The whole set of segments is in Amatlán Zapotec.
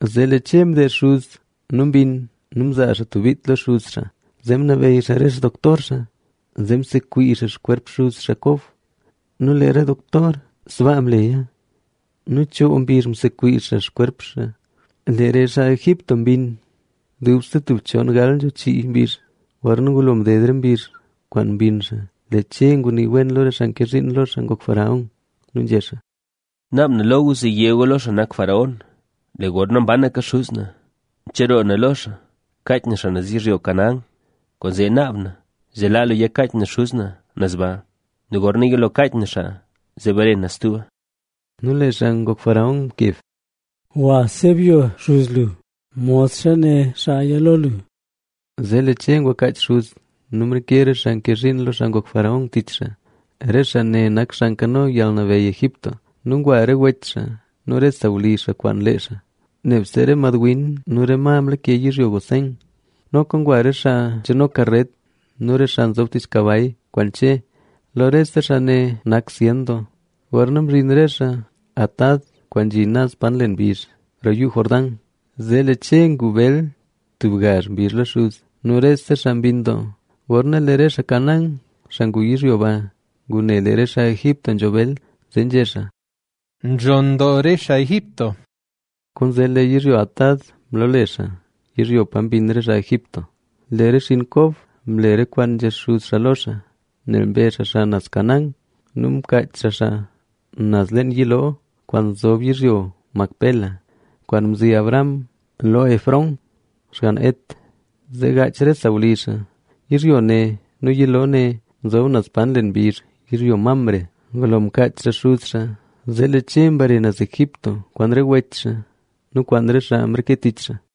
Zee lee Che mdeezh xuz nu mbinn nu mzaa tub bit lo xuz xaa. Zee ngunabeyy xaa re xdoctor xaa, zee sekwiizh xaa xkwerp xuz xaa Kob. Nu lee re doktor, sbaa mleya. Nu choo mbizh msekwiizh xaa xkwerp xaa. Lee re xaa Egipto mbinn dubse chon gal nzho chii mbizh. Gorna ngulo mded re mbizh kwaan mbinn xaa. Lee Che ngunii lo re xaa nke zhiin lo xaa ngok faraón nu nzhé xaa: —Naab na lo gu zee yé gu lo xaa nak faraón: “Lee gorna mbanaka xuz na, mcheroo na lo xaa kaach na xaa naz yizhyo Canaán. Kwaanzee naab na, zee laa lu ya kaach na xuz na naz ba. Nu gorna yilo kaach na xaa, zee bare na stuba.” Nu lee xaa ngok faraón mkeb: —Gwa sebyo xuz lu, modxa né xaaya lo lu. Zee lee Che ngwa kaach xuz nu mreke re xaa mke zhiin lo xaa ngok faraón tich xaa, re xaa ne nak xaa nkano yalnabeyy Egipto. Nu ngwa re wech xaa nu re sawlizh xaa kwaan lee xaa. Nebse re mad win nu re ma mlake yizhyo Gosén. Noka ngwa re xaa nzhano karet nu re xaa nzob tich kabay kwaan Che. Nu rese xaa ne nak zyen doo. Gorna mzhin re xaa Atad, kwaan nzhi naz pa nlen mbizh roo Yuu Jordán, zee lee Che ngu bel tub gazh mbizh lo xuz. Nu rese xaa mbinn doo. Gorna lee re xaa Canaán, xaa ngu yizhyo ba, ngune lee re xaa Egipto nzho bel, zee nzhé xaa: —Nzhonn doo re xaa Egipto. Kwaanzee lee yizhyo Atad mloole xaa: “Yizhyo pa mbinn re xaa Egipto”. Lee re xinn Kob mle re kwaan nzhé xuz xaa lo xaa, nel mbe xaa xaa naz Canaán nu mkaach xaa xaa naz leen yiloo kwaan nzob yizhyo Macpela, kwaan mzi Abraham lo Efrón, xgann Het, zee gaach re sawlizh xaa. Yizhyo ne nu yiloo ne nzob naz pa nlen mbizh yizhyo Mamre. Ngulo mkaach xaa xuz xaa, zee lee Che mbare naz Egipto kwaan re wech xaa nu kwaan re xaa mreke tich xaa.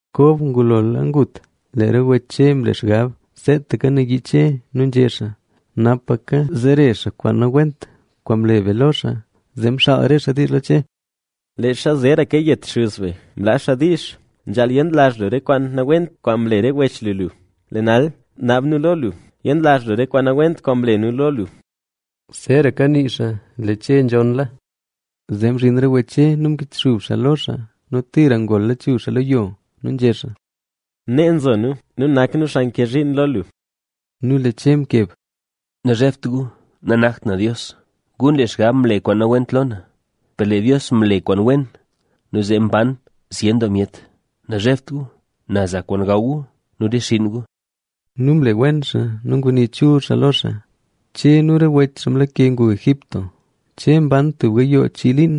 Kob ngulola ngut, lee re wech Che mle xgab seetaka nayii Che nu nzhé xaa: “Napa kazere xaa kwaan nawent kwaan mle be lo xaa”. Zee mxaal re xaa diizh lo Che: —Leezha zeeraka yet xuz be mlaa xaa diizh: “Nzhaal yenlazh lu re kwaan nawent kwaan mle re wech lu lu”. Lee nal, naab nu lo lu yenlazh lu re kwaan nawent kwaan mle nu lo lu. Zeeraka nii xaa lee Che nzhonnla. Zee mzhin re wech Che nu mkichxub xaa lo xaa nu tira ngol lachuzh xaa lo yo. Nu nzhé xaa: —Nee nzo nu; nu nak nu xaa nke zhiin lo lu. Nu lee Che mkeb: —Nazhebt gu. Nanakt na Dios. Gu nle xgab mle kwaan nawent lo na; per lee Dios mle kwaan wen nu zee mban zyen doo myet. Nazhebt gu, na za kwaan gaw gu nu re xinn gu. Nu mle wen xaa nu ngunii chul doo xaa lo xaa. Che nu re wech xaa mlake ngu Egipto. Che mban tub gayoo chii liin.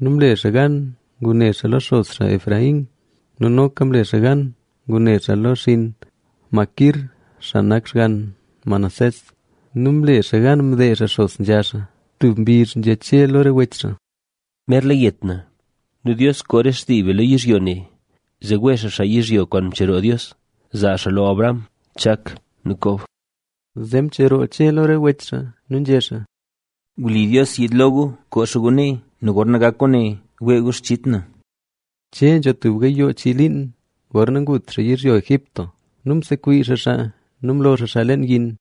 Nu mle xaa gan ngune xaa lo xos Efraín. Nu noka mle xaa gan ngune xaa lo xinn Maquir, xaa nak xgann Manasés. Nu mle xaa gan mdeezh xaa xos nzha xaa. Tub mbizh Che nzhé lo re wech xaa: —Merla yet na. Nu Dios koo re xtii be lo yizhyo ne, zee wee xaa xaa yizhyo kwaan mcheroo Dios zaa xaa lo Abraham, Chak nu Kob. Zee mcheroo Che lo re wech xaa nu nzhé xaa: —Wli Dios yiid lo gu nu koo xaa gu nee, gorna gak kwaane wee gu xchit na. Che nzho tub gayoo chii liin gorna ngut xaa yizhyo Egipto nu msekwiizh xaa xaa nu mlo xaa xaa leen yin.